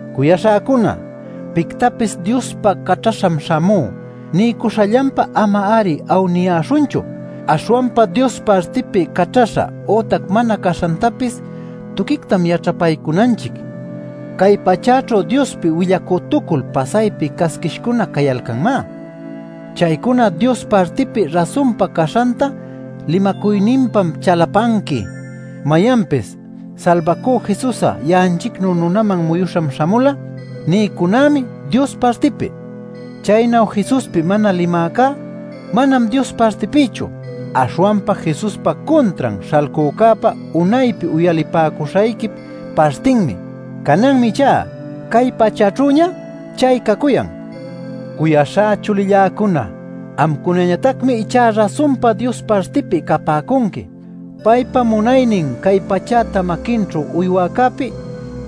Cuyaśhäcuna, pictapis “Diospa caćhaśham śhamú” niycuśhallanpá ama-ari awniyäśhunchu. Aśhwanpa Dios partipi caćhaśha ütac mana caśhantapis tuquictam yaćhapaycunanchic. Cay pachäćhu Diospi willacütucul pasaypi casquishcuna cayalcanmá. Chaycuna Dios partipi rasunpa caśhanta limacuyninpam chalapanqui: mayanpis “Salbacüca Jesus ya'anchicnu nunaman muyuśham śhamula” nïcunämi Dios partipi. Chaynu Jesuspi mana limäcá manam Dios partipïchu. Aśhwanpa Jesuspa cuntran śhalcücäpa unaypi uyalipäcuśhayquip partinmi. Cananmi ichá cay pachäćhüña chay cacuyan. Cuyaśhá chulilläcuna, amcunañatacmi ichá rasunpa Dios partipi capäcunqui. Paypa munaynin cay pachäta maquinćhu uywäcäpi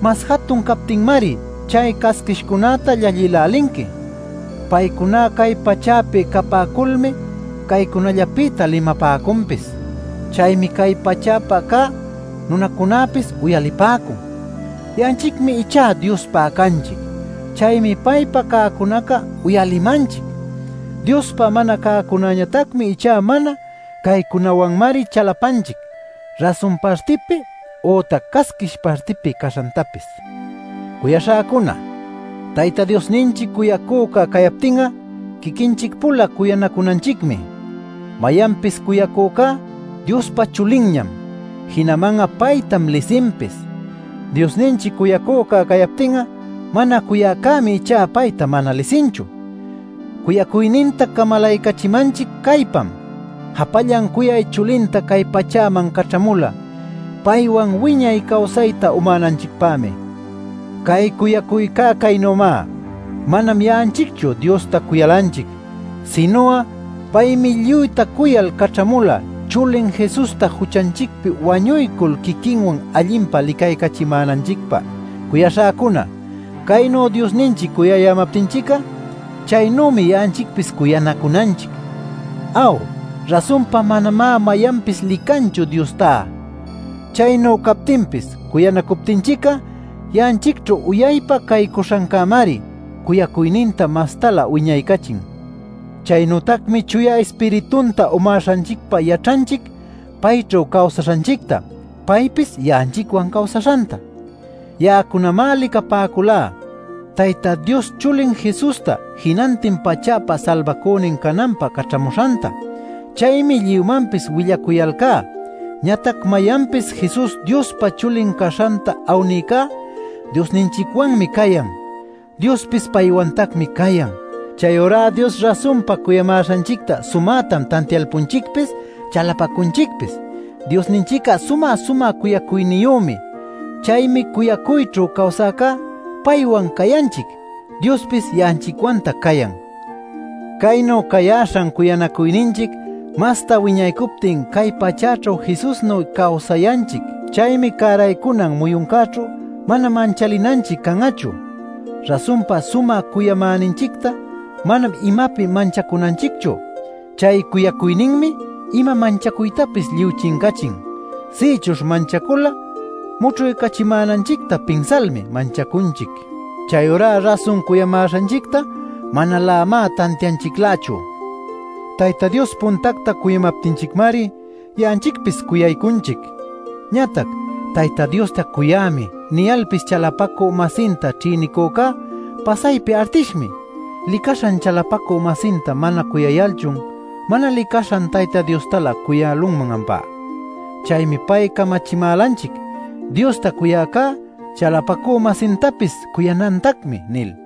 mas jatun captinmari chay casquishcunäta llallïlälinqui. Paycuna cay pachäpi capäculmi caycunallapïtac limapäcunpis. Chaymi cay pachäpä cä nunacunäpis uyalipäcun. Ya'anchicmi ichá Diospa canchic. Chaymi paypa cäcunaca uyalimanchic. Diospa mana cäcunañatacmi ichá mana. Caycunawanmari chalapanchic rasun partipi ütac casquish partipi caśhantapis. Cuyaśhäcuna, Tayta Diosninchic cuyacüca cayaptin'a, quiquinchic-pula cuyanacunanchicmi. Mayanpis cuyacücá Diospa chulinñam, jinaman'a paytam lisinpis. Diosninchic cuyacüca cayaptin'a mana cuyäcämi ichá payta mana lisinchu. Cuyacuyninta camalaycachimanchic caypam: japallan cuyay chulinta cay pachäman caćhamula, paywan wiñay cawsayta umänanchicpämi. Cay cuyacuyca caynümá: Manam ya'anchicchu Diosta cuyalanchic, sinu'a paymi lluyta cuyal caćhamula chulin Jesusta juchanchicpi wañuycul quiquinwan allinpa licaycachimänanchicpä. Cuyaśhäcuna, caynu Diosninchic cuyayämaptinchic'a, chaynümi ya'anchicpis cuyanacunanchic. Aw, rasunpa manamá mayanpis licanchu Diostá. Chaynu captinpis cuyanacuptinchic'a ya'anchicćhu uyaypa caycuśhancämari cuyacuyninta mastalä wiñaycachin. Chaynütacmi Chuya Ispiritunta umäśhanchicpa yaćhanchic payćhu cawsaśhanchicta, paypis ya'anchicwan cawsaśhanta. Ya'acunamá licapäculá Tayta Dios chulin Jesusta jinantin pachäpa Salbacünin cananpä caćhamuśhanta. Chaymi lluymanpis willacuyalcá. Ñatac mayanpis Jesus Diospa Chulin caśhanta awnïcá Diosninchicwanmi cayan, Diospis paywantacmi cayan. Chayurá Dios rasunpa cuyamäśhanchicta sumätam tantialpunchicpis chalapacunchicpis. Diosninchic'a sumä-sumä cuyacuyniyümi. Chaymi cuyacuyćhu cawsäcá paywan cayanchic, Diospis ya'anchicwantac cayan. Caynu cayäśham cuyanacuyninchic masta wiñaycuptin cay pachäćhu Jesusnuy cawsayanchic. Chaymi cäraycunan muyuncäćhu mana manchalinanchic can'achu. Rasunpa sumä cuyamäninchicta manam imapi manchacunanchicchu. Chay cuyacuyninmi ima manchacuytapis lluy chincachin. Sïchuśh manchacul'a mućhuycachimänanchicta pinsalmi manchacunchic. Chayurá rasun cuyamäśhanchicta manalämá tantianchiclächu. Tayta Dios puntacta cuyamaptinchicmari ya'anchicpis cuyaycunchic. Ñatac “Tayta Diosta cuyämi” niyalpis chalapacü-masinta ćhïnicücá pasaypi artishmi. ¿Licaśhan chalapacü-masinta mana cuyayalchun, mana licaśhan Tayta Diostalä cuyälunman ampá? Chaymi pay camachimälanchic: “Diosta cuyäcá, chalapacü-masintapis cuyanantacmi” nil.